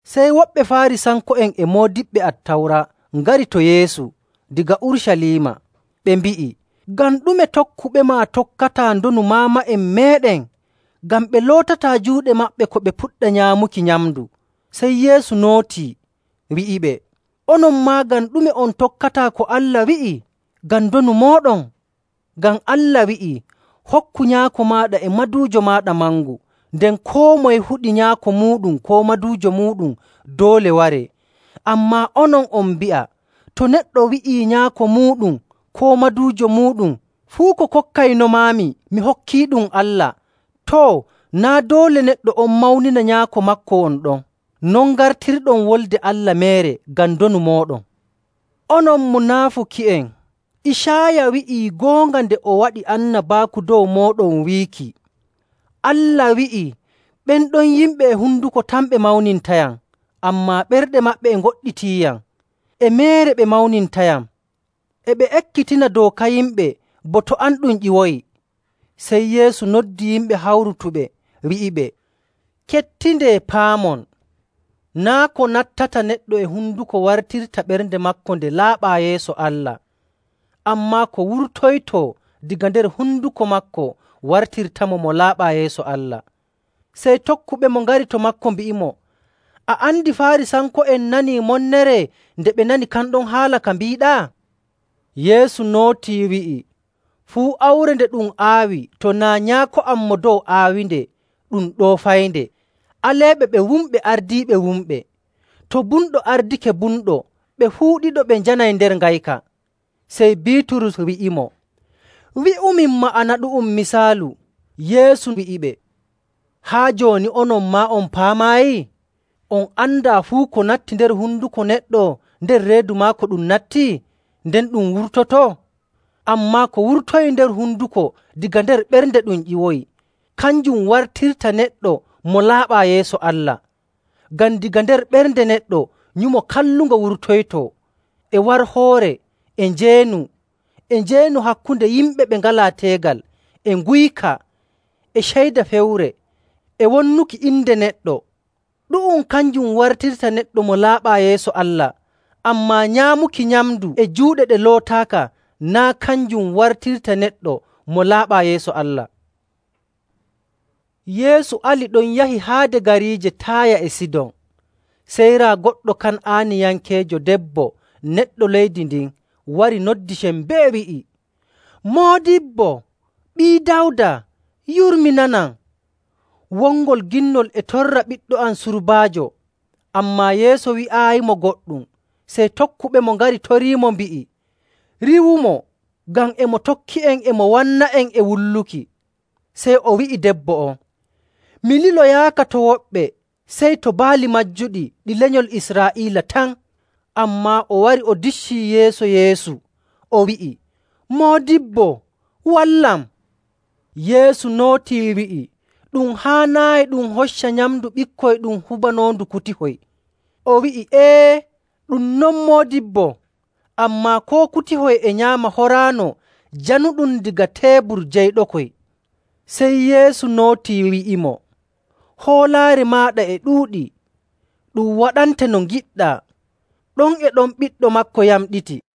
Sey woɓɓe Faarisanko'en e moodiɓɓe Attawra ngari to Yeesu daga Urucaliima, ɓe mbi'i, “Ngam ɗume tokkuɓema tokkataa ndonu maama'en meeɗen? Ngam ɓe lootataa juuɗe maɓɓe ko ɓe puɗɗa nyaamuki nyamndu.” Sey Yeesu nootii, wi'iɓe, “Onon maa, ngam ɗume on tokkataa ko Allah wi'i ngam ndonu mooɗon? Ngam Allah wi'ii, ‘Hokku nyaako maaɗa e maduujo maaɗa mangu,’ nden, ‘Koo moye huɗi nyaako muuɗum koo maduujo muuɗum doole waree.’. Ammaa onon on mbi'a to neɗɗo wi'ii nyaako muuɗum koo maduujo muuɗum, ‘Fuu ko kokkaynomaami, mi hokkiiɗum Allah,’ too, naa' doole neɗɗo on mawnina nyaako maako won ɗon. Non ngartirɗon Wolde Allah meere ngam ndonu mooɗon. Onon munaafuki'en! Icaaya wi'ii goonga nde o waɗi annabaaku dow mooɗon wiiki, Allah wi'ii, ‘Ɓen ɗon yimɓe e honduko tan ɓe mawnintayam, ammaa ɓerɗe maɓɓe e ngoɗɗitiiyam. E meere ɓe mawnintayam. E ɓe ekkitina dooka yimɓe bo to am ɗum ƴiwoyi.’”. Sey Yeesu noddi yimɓe hawrutuɓe, wi'iɓe, “Kettindee, paamon. Naa' ko nattata neɗɗo e honduko wartirta ɓernde maako nde laaɓaa yeeso Allah, ammaa ko wurtoytoo daga nder honduko maako wartirtamo mo laaɓaa yeeso Allah.” Sey tokkuɓemo ngari to maako, mbi'imo, “A andi Faarisanko'en nanii monnere nde ɓe nani kan ɗon haala ka mbiiɗaa?” Yeesu nootii, wi'i, “Fuu awre nde ɗum aawi, to naa' Nyaako am Mo Dow aawinde, ɗum ɗoofaynde. Aleeɓe! Ɓe wumɓe ardiiɓe wumɓe. To bumɗo ardake bumɗo, ɓe fuu ɗiɗo ɓe njanay nder ngayka.”. Sey Biiturus wi'imo, “Wi'umin ma'ana ɗu'um misaalu.” Yeesu wi'iɓe, “Haa jooni onon maa on paamaayi? On andaa fuu ko natti nder honduko neɗɗo nder reedu maako ɗum natti, nden ɗum wurtoto? Ammaa ko wurtoyii nder honduko, daga nder ɓernde ɗum ƴiwoyi. Kanjum wartirta neɗɗo mo laaɓaa yeeso Allah.. Ngam daga nder ɓernde neɗɗo nyumo kallungo wurtoytoo, e warhoore, e njeenu, e njeenu hakkunde yimɓe ɓe ngalaa teegal, e nguyka, e ceyda fewre, e wonnuki inde neɗɗo. Ɗu'um kanjum wartirta neɗɗo mo laaɓaa yeeso Allah, ammaa nyaamuki nyamndu e juuɗe ɗe lootaaka naa' kanjum wartirta neɗɗo mo laaɓaa yeeso Allah.” Yeesu ali ɗon yahi haade gariije Taaya e Sidon. Sey raa goɗɗo Kan'aaniyankeejo debbo neɗɗo leydi ndin wari noddi sembee, wi'i, “Moodibbo, Ɓii Dawda, yurminanam! Wongol ginnol e torra ɓiɗɗo am surbaajo.” Ammaa Yeesu wi'aayimo goɗɗum. Sey tokkuɓemo ngari toriimo, mbi'i, “Riiwumo, ngam e mo tokki'en e mo wanna'en e wulluki!” Sey o wi'i debbo on, “Mi liloyaaka to woɓɓe, sey to baali majjuɗi ɗi lenyol Israa'iila tan.” Ammaa o wari o diccii yeeso Yeesu, o wi'i, “Moodibbo, wallam!” Yeesu nootii, wi'i, “Ɗum haanaayi ɗum hocca nyamndu ɓikkoy ɗum hubanoondu kutihoy.” O wi'i, “Ee, ɗum non, Moodibbo, ammaa koo kutihoy e nyaama horaano januɗum daga teebur jeyɗokoy.” Sey Yeesu nootii, wi'imo, “Hoolaare maaɗa e ɗuuɗi! Ɗum waɗante no ngiɗɗaa.” Ɗon e ɗon ɓiɗɗo maako yamɗiti.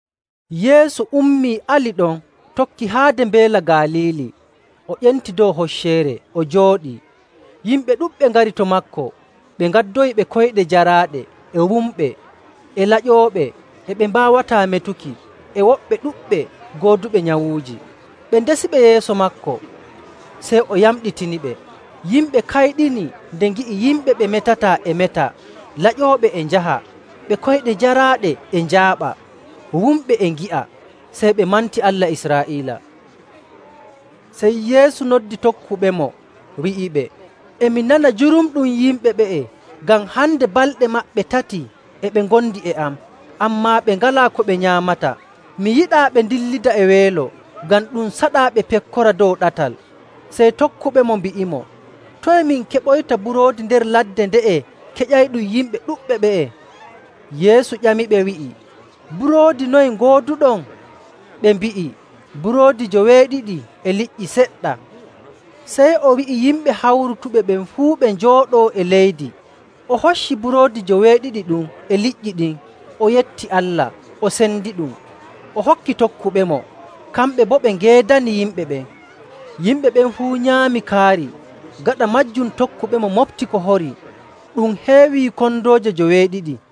Yeesu ummii, ali ɗon, tokki haade Mbeela Galiili, o ƴenti dow hocceere o jooɗii. Yimɓe ɗuɗɓe ngari to maako, ɓe ngaddoyi ɓe koyɗe jaraaɗe, e wumɓe, e laƴooɓe, e ɓe mbaawataa metuki, e woɓɓe ɗuɗɓe gooduɓe nyawuuji. Ɓe ndesiɓe yeeso maako, sey o yamɗitiniɓe. Yimɓe kayɗini nde ngi'i yimɓe ɓe metataa e meta, laƴooɓe e njaha, ɓe koyɗe jaraaɗe e njaaɓa, wumɓe e ngi'a. Sey ɓe manti Allah Israa'iila. Sey Yeesu noddi tokkuɓemo, wi'iɓe, “E mi nana jurumɗum yimɓe ɓe'e ngam hande balɗe maɓɓe tati e ɓe ngondi e am, ammaa ɓe ngalaa ko ɓe nyaamata. Mi yiɗaa ɓe ndillida e weelo, ngam ɗum saɗaa ɓe pekkora dow ɗatal.” Sey tokkuɓemo mbi'imo, “Toye min keɓoyta buroodi nder ladde nde'e keƴayɗum yimɓe ɗuɗɓe ɓe'e?” Yeesu ƴamiɓe wi'i, “Buroodi noye ngooduɗon?” Ɓe mbi'i, “Buroodi joweeɗiɗi e liƴƴi seɗɗa.” Sey o wi'i yimɓe hawrutuɓe ɓen fuu ɓe njooɗoo e leydi. O hocci buroodi joweeɗiɗi ɗum e liƴƴi ɗin, o yetti Allah, o sendiɗum, o hokki tokkuɓemo, kamɓe boo ɓe ngeedani yimɓe ɓen. Yimɓe ɓen fuu nyaami kaari. Gaɗa maajum tokkuɓemo moɓti ko horii, ɗum heewi kondooje joweeɗiɗi.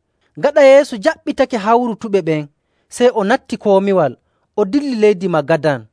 Gaɗa Yeesu jaɓɓitake hawrutuɓe ɓen, sey o natti komiwal, o dilli leydi Magadan.